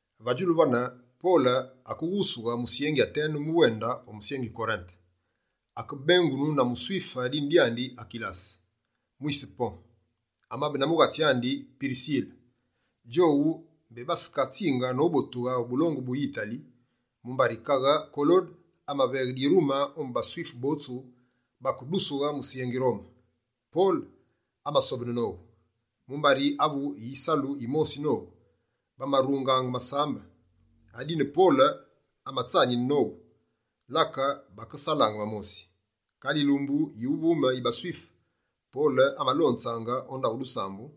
Va djulu vane, Pole akeghusughe musyengi Atene mu wende o musyengi Korinte. Akebengunu na muSwife dine dyandi Akilase, mwise Pon. Amabe na mughatsi andi Pirisile. Djowu mbé basekatsinge nobotughe o bulongu bu Yitali, mumbari kaghe Kolode amaveghe dirume ombu baSwife botsu bakedusughe musyengi Rome. Pole amasobene nowu, mumbari avu na yisalu yimosi nowu, bamarungaange masambe. Adine Pole amatsanine nowu, lake bakesalaange va mosi. Kale yilumbu yuvume yi baSwife, Pole amalonzaange o ndaghu dusambu,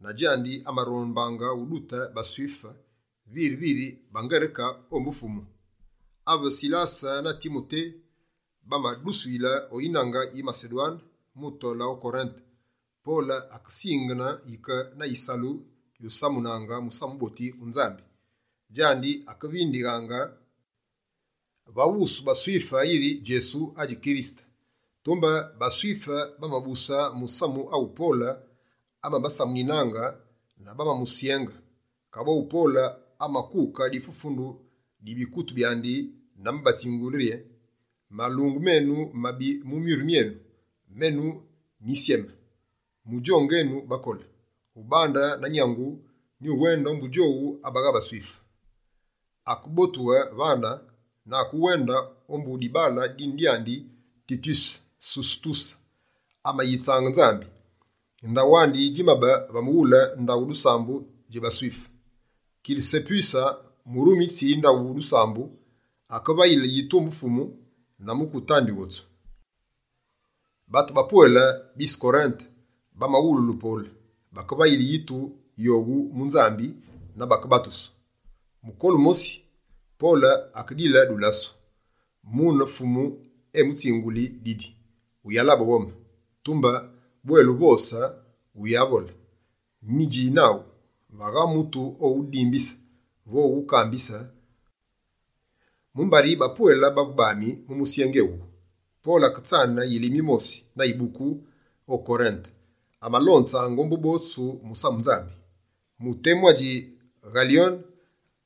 na djandi amarombaange udute baSwife viri viri baNgereke ombu Fumu. Ave Silase na Timote bamadusuyile o yinange yi Masedwane mu tole o Korinte, Pole akesingene yike na yisalu yusamunaange Musamu Wuboti wu Nzambi. Djandi akevindighaange va wusu baSwife yiri Djesu adji Kirisete. Tumbe baSwife bamabuse musamu awu Pole, amabasamuninaange na bamamusyenge. Kaboghu Pole amakuke difufundu di bikutu byandi na amabatsingule yi: «Malungu menu mabi mu myuru myenu! Menu nyisyeme. Mudjonge enu bakole. Ubandile na nyangu, nyuwende ombu djowu abagha baSwife.» Akebotughe vane na akewende ombu dibaale dine dyandi Tityuse Susutuse, amayitsaange Nzambi. Ndaghu wandi djimabe va mughule ndaghu dusambu dji baSwife. Kirisepuse yivunde yi ndaghu dusambu, akevayile yitu ombu Fumu, na mukute andi wotsu. Batu bapwele bise Korinte, bamawululu Pole. Bakevayile yitu yowu mu Nzambi na bakebatusu. Mukolu mosi, Pole akedile dulasu, mune Fumu emutsinguli didi: «Wuyala ghome. Tumbe bwela uvose, wuyavole: nyidji naghu. Vagha mutu oghudimbise vo oghukambise, mumbari bapwele bavu bami mu musyengi ewuwu.» Pole aketsane yilime yimosi na yibuku o Korinte, amalonzaange ombu botsu musamu Nzambi. Mu temu adji Ghalyone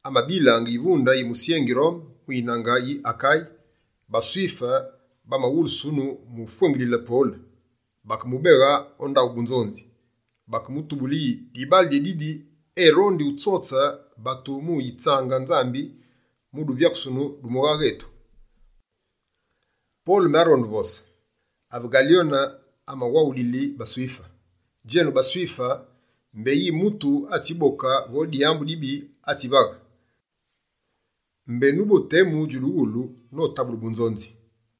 amabilaange yivunde yi musyengi Rome mu yinange yi Akaye, baSwife bamawulusunu mu ufwengilile Pole. Bakemubeghe o ndaghu bunzonzi. Baketubule yi: «Dibaale dyédidi erondi utsotse batu mu yitsaange Nzambi mu duvyakusunu du mughaghe etu.» Pole mbé aronde uvose, ave Ghalyone amawaghulili baSwife: «Djenu baSwife, mbé yi mutu atsiboke vo dyambu dibi atsivaghe, mbé nubo temu djuduwulu, notabule bunzonzi.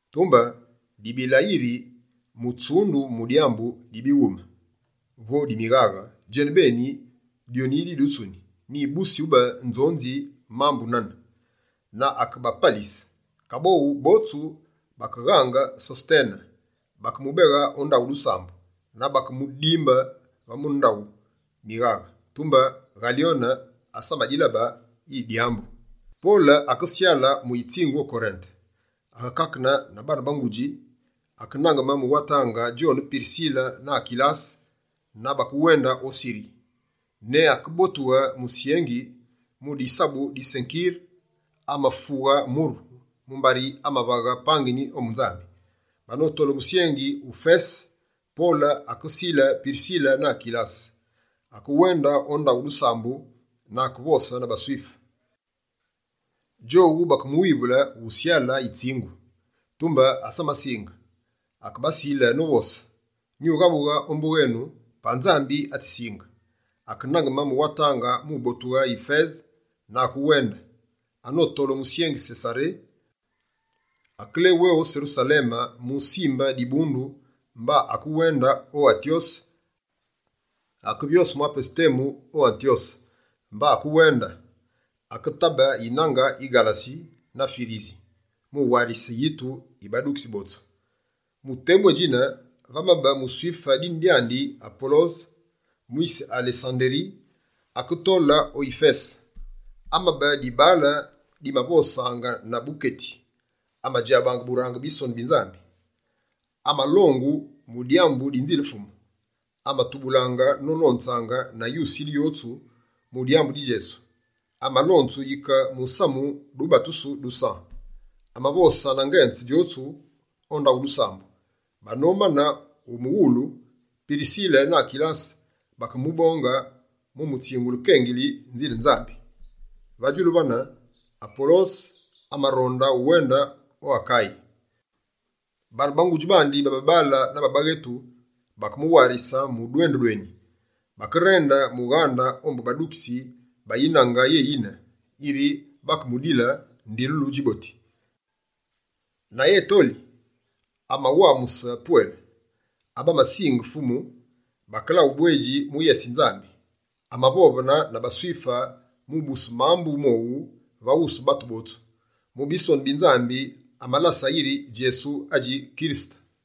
Tumbe dibila yiri, mutsundu mu dyambu di bighume, mine, vo di mughaghe djenubeni, dyoni didutsuni. Nyibusi ube nzonzi dji mambu nane!» Na akebapalise. Kaboghu, botsu bakeghange Sosetene, yivunde yi ndaghu dusambu, na bakemudimbe va mune ndaghu mighaghe. Tumbe Ghalyone asamadilabe yi dyambu. Pole akesyale mu yitsingu o Korinte. Akekakene na baane ba ngudji, akenangeme mu watange djone Pirisile na Akilase na bakewende o Siri. Ne akebotughe musyengi, mu disabu di Senkire, amafughe muru, mumbari amava pangini ombu Nzambi. Banotole o musyengi Yifese, Pole akesile Pirsile na Akilase. Akewende o ndaghu dusambu na akevose na baSwife. Djowu bakemuwivule usyale yitsingu, tumbe asamasinge. Akebasile novose: «Nughabughe ombu wenu, pa Nzambi atsisinge.» Akenangeme mu watange mu botughe Yifese, na akewende. Anotole o musyengi Sesaré, akelewé o Serusaleme musimbe dibundu, mba akewende o Antyose. Akevyose mwa pesu temu o Antyose, mba akewende. Aketabe yinange yi Ghalasi na Firisi, mu warise yitu yi badukitsi botsu. Mu temu édjine, vamabe muSwife dine dyandi Apolose, mwise Alesanderi, aketole o Yifese. Amabe dibaale dimavosaange na buketi, amadjabaange burange Bisonu bi Nzambi. Amalongu mu dyambu di Nzile Fumu, amatubulaange nolonze na yusile yotsu mu dyambu di Djesu. Amalonzu yike musamu dubatusu du San. Amavose na ngenze djotsu o ndaghu dusambu. Banomane umuwulu, Pirisile na Akilase bakemubonge mu mutsingule kengili Nzile Nzambi. Va djulu vane, Apolose amaronde uwende o Akaye. Baane ba ngudji bandi ba babaale na baghetu bakemuwarise mu dwendu dweni. Bakerende mughande ombu badukitsi ba yinange yéyine, yiri bakemudile ndilulu djiboti. Na etoli, amawamuse pwele, abamasinge Fumu, bakela ubwedji mu yese yi Nzambi. Amavovene na baSwife mu ubuse mambu mowu va wusu batu botsu. Mu Bisonu bi Nzambi, amabalase yiri Djesu adji Kirisete.